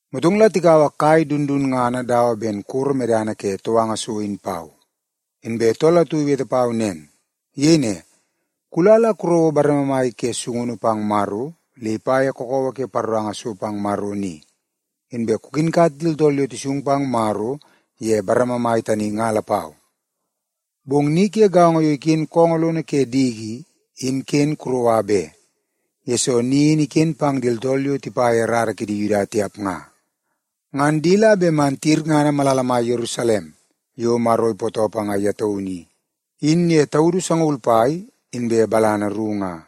Motong la tikaua kai dundunngana dawa ben koro medana ke touanga so in pau, inbe tool atu iwete pau nen. Iyei ne, “Kula la kurouo bareme mai ke sungunu pang Maro le ipa ye kakawa ke paroranga so pang Maro ni, inbe kukinkat di tooltool yo tisung pang Maro ye bareme mai tani nga lapau. Bong ni ke gaongo yo iken koongoo lono ke diki i, in ken kuroua be, yesoo ni in iken pang di tooltool yo tipa ye rara ke di Yuda tiap nga. Ngan di la bet man tiyirngana malala mai Yerusalem yo Maro ipootoo panga ye taunu i, in ye taudu sangaul pai inbe balana ru nga.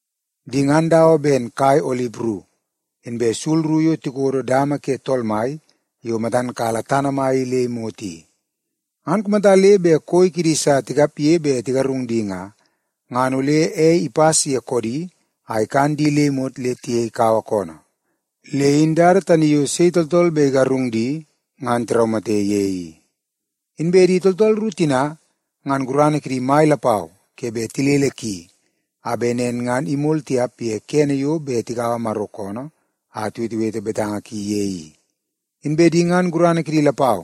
Di ngan dawa ben kai olip ru inbe sul ru yo tikodo dama ke Tool Mai yo matan kala tana mai i le imot i. Ngan kumata le bet koi kidi sa tikapge bet tigarung di nga, ngan ole ei ipas ye koodi a ikan di le imot le tiyei kawa koonoo. Le in dada tani yo sei tooltool bet igarung di ngan tiraumate ye i. Inbe di tooltool ru tina, ngan gurana kidi mai lapau ke bet tilele ki, a bet nen ngan imol tiap ye kene yo bet tikaua Maro koonoo a tiwetewete betanga ki ye i. Inbe di ngan gurana kidi lapau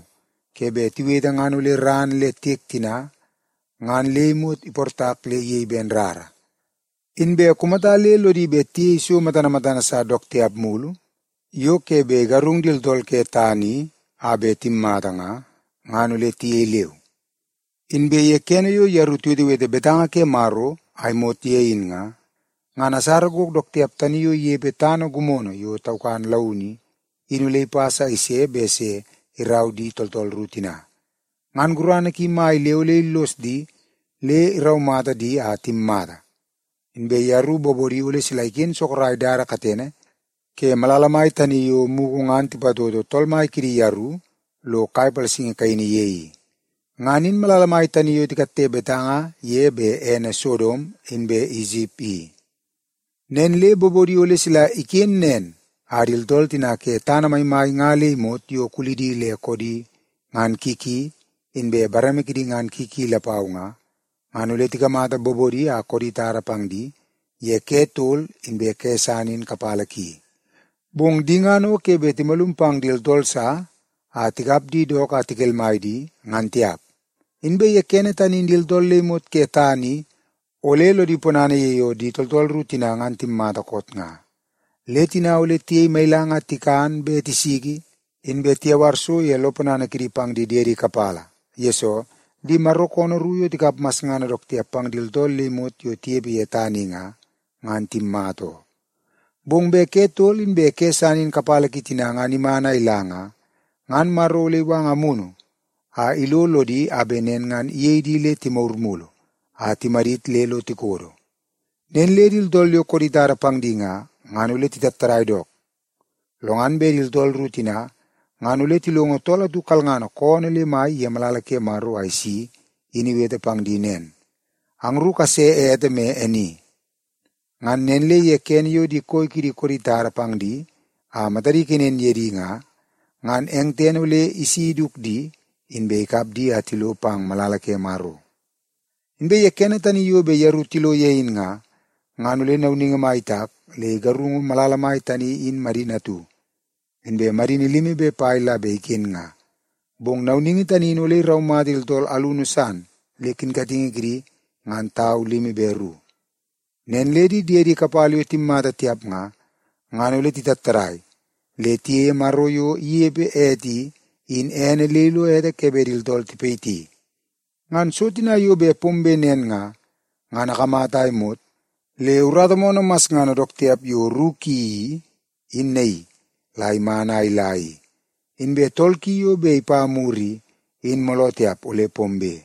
ke bet tiwete ngan ole ran le tiek tina ngan le imot iportak le iyei ben rara. Inbe kumata le lodi bet tiyei so matana matana sa dook tiap mulu yo ke bet igarung di tooltool ke tana i a bet timmata nga, ngan ole tiyei leu. Inbe ye kene yo yeru tiwetewete betanga ke Maro a imot ye in nga, ngan asara gok dook tiap tani yo inepe tana gimono yo taukan launu i, in ole ipas a ise bet se irau di tooltool ru tina. Ngan gurana ki mai le ole illos di le iraumata di a timmata. Inbe yeru bobodi ole sila iken sorok dada katene ke malala mai tani yo mugu ngan tipatoto Tool Mai kidi yeru lo kai palasingi kaini ye i. Ngan in malala mai tani yo tikatte betanga ye bet ene Sodom inbe Isip i. Nen le bobodi ole sila iken nen a di tooltool tina ke tana maimai nga le imot yo kulidi le koodi ngan ki ki inbe bareme kidi ngan ki ki lapau nga, ngan ole tikamata bobodi a koodi tada pang di ye ke tol inbe ke san in kapala ki. Bong di ngan o ke bet timalum pang di tooltool sa a tikap di dook la tikelmai di, ngan tiap. Inbe ye kene tani in di tooltool le imot ke tana i ole lodi ponana ye yo di tooltool ru tina ngan timmata koot nga. Le tina ole tiyei mailang a tikan be tisiki, inbe tiyawar so ye lo ponana kidi pang di diedi kapala, yesoo di Maro koonoo ru yo tikap masngana dook tiap pang di tooltool le imot yo tinepe ye tana i nga, ngan timmata oo. Bong bet ke tol inbe ke san in kapala ki tina ngan iman a ila nga, ngan Maro ole iwanga Amunu a ilo lodi a bet nen ngan iyei di le timagur mulu a timadit le lo tikodo. Nen le di tooltool yo koodi tada pang di nga, ngan ole titattadai dook. Lo ngan bet di tooltool ru tina ngan ole tilongo tool atu kalngana koonoo le mai ye malala ke Maro a isi in iwete pang di nen, “Angru kase ete me e ni.” Ngan nen le ye kene yo di koi kidi koodi tada pang di a matadi ikenen ye di nga, ngan eng tene ole isi iduk di, inbe ikap di a tilo pang malala ke Maro. Inbe ye kene tani yo bet yeru tilo ye in nga, ngan ole nauningi mai itak le igarungu malala mai tani in madini atu, inbe madini limi be pai la bet iken nga. Bong nauningi tani in ole iraumata di tooltool alunu san le kinkatingi kidi ngan tau limi be ru. Nen le di diedi kapala yo bet timmata tiap nga, ngan ole titattadai le tiyeie Maro yo inepe ete ni, in ene le ilo ete ke bet di tooltool tipayiti. Ngan so tina yo bet pombe nen nga, ngan akamata a imot le urata moonoo masngana dook tiap yo ru ki i, in naii la iman a ila i, inbe tol ki yo bet ipa mur i, in mooloo tiap ole pombe.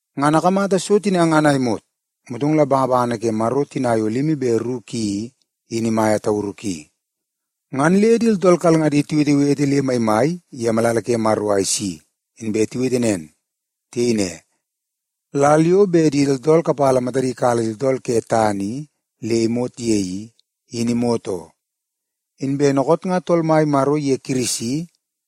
Ngan akamata so tina ngan a imot, motong la bangabangana ke Maro tina yo limi be ru ki i, in imaia tauru ki, ngan le di tooltool kalngadi tiwetewete le maimai ye malala ke Maro a isi, inbe tiwete nen. Tiyei ne, “Lal yo bet di tooltool kapala matadi kala di tooltool ke tana i le imot ye i, in imot oo. Inbe dookoot nga Tool Mai Maro iye Kirisi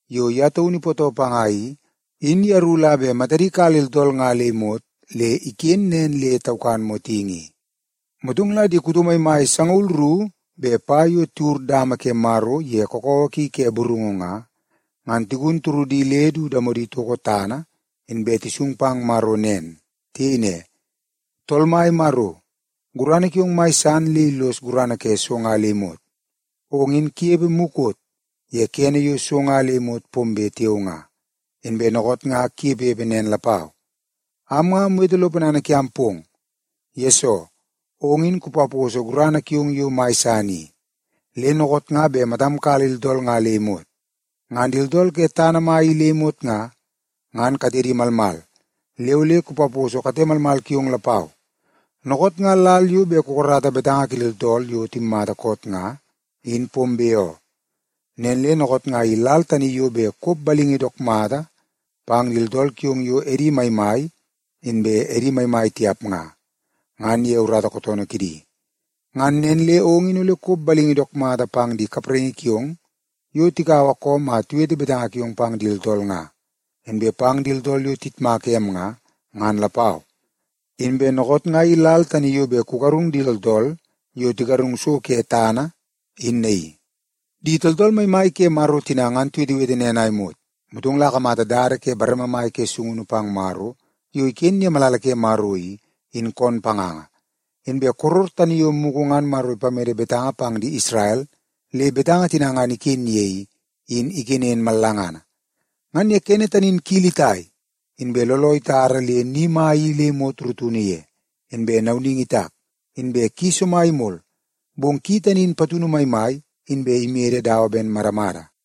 yo ye taunu ipootoo panga i, in yeru la bet matadi kala di tooltool nga le imot le iken nen le taukan motingi i.” Motong la di kuto maimai sangaul ru be pai yo tiwur dama ke Maro ye kakawa kidi ke burungu nga, ngan tigun turudi le du damodi itoko tana, inbe tisung pang Maro nen. Tiyei ne, “Tool Mai Maro, gurana kiong mai san le illos gurana ke so nga le imot. Ong in kunepe mukot ye kene yo so nga le imot pombe tiao nga, inbe dookoot nga kunepepe nen lapau. Am nga amwete lo ponana kiam pong, yesoo ong in kupaposo gurana kiong yo mai san i, le dookoot nga bet matam kala di tooltool nga le imot. Ngan di tooltool ke tana mai i le imot nga, ngan katedi malmal, le ole kupaposo kate malmal kiong lapau. Dookoot nga lal yo bet kukarata betanga ke di tooltool yo timmata koot nga, in pombe oo. Nen le dookoot nga i lal tani yo bet kop balingi dook mata pang di tooltool kiong yo edi maimai inbe edi maimai tiap nga, ngan ye urata kootoonoo kidi. Ngan nen le ong in ole kop balingi dook mata pang di kapraingi kiong yo tikaua koom a tiwete betanga kiong pang di tooltool nga, inbe pang di tooltool yo tiyitmaka em nga, ngan lapau. Inbe dookoot nga i lal tani yo bet kugarung di tooltool yo tigarung so ke tana in naii.” Di tooltool maimai ke Maro tina ngan tiwetewete nen a imot, motong la akamata dada ke bareme mai ke sungunu pang Maro yo iken ye malala ki i, in koon panganga. Inbe koror tani yo mugu ngan Maro ipamede betanga pang di Isrel le betanga tina ngan iken ye i, in ikenen mallangana. Ngan ye kene tani in kili itai, inbe looloo itara le ni mai i le imot rutunu ye, inbe nauningi itak, inbe ki somai imol, bong ki tani in patunu maimai inbe imede dawa ben madamada.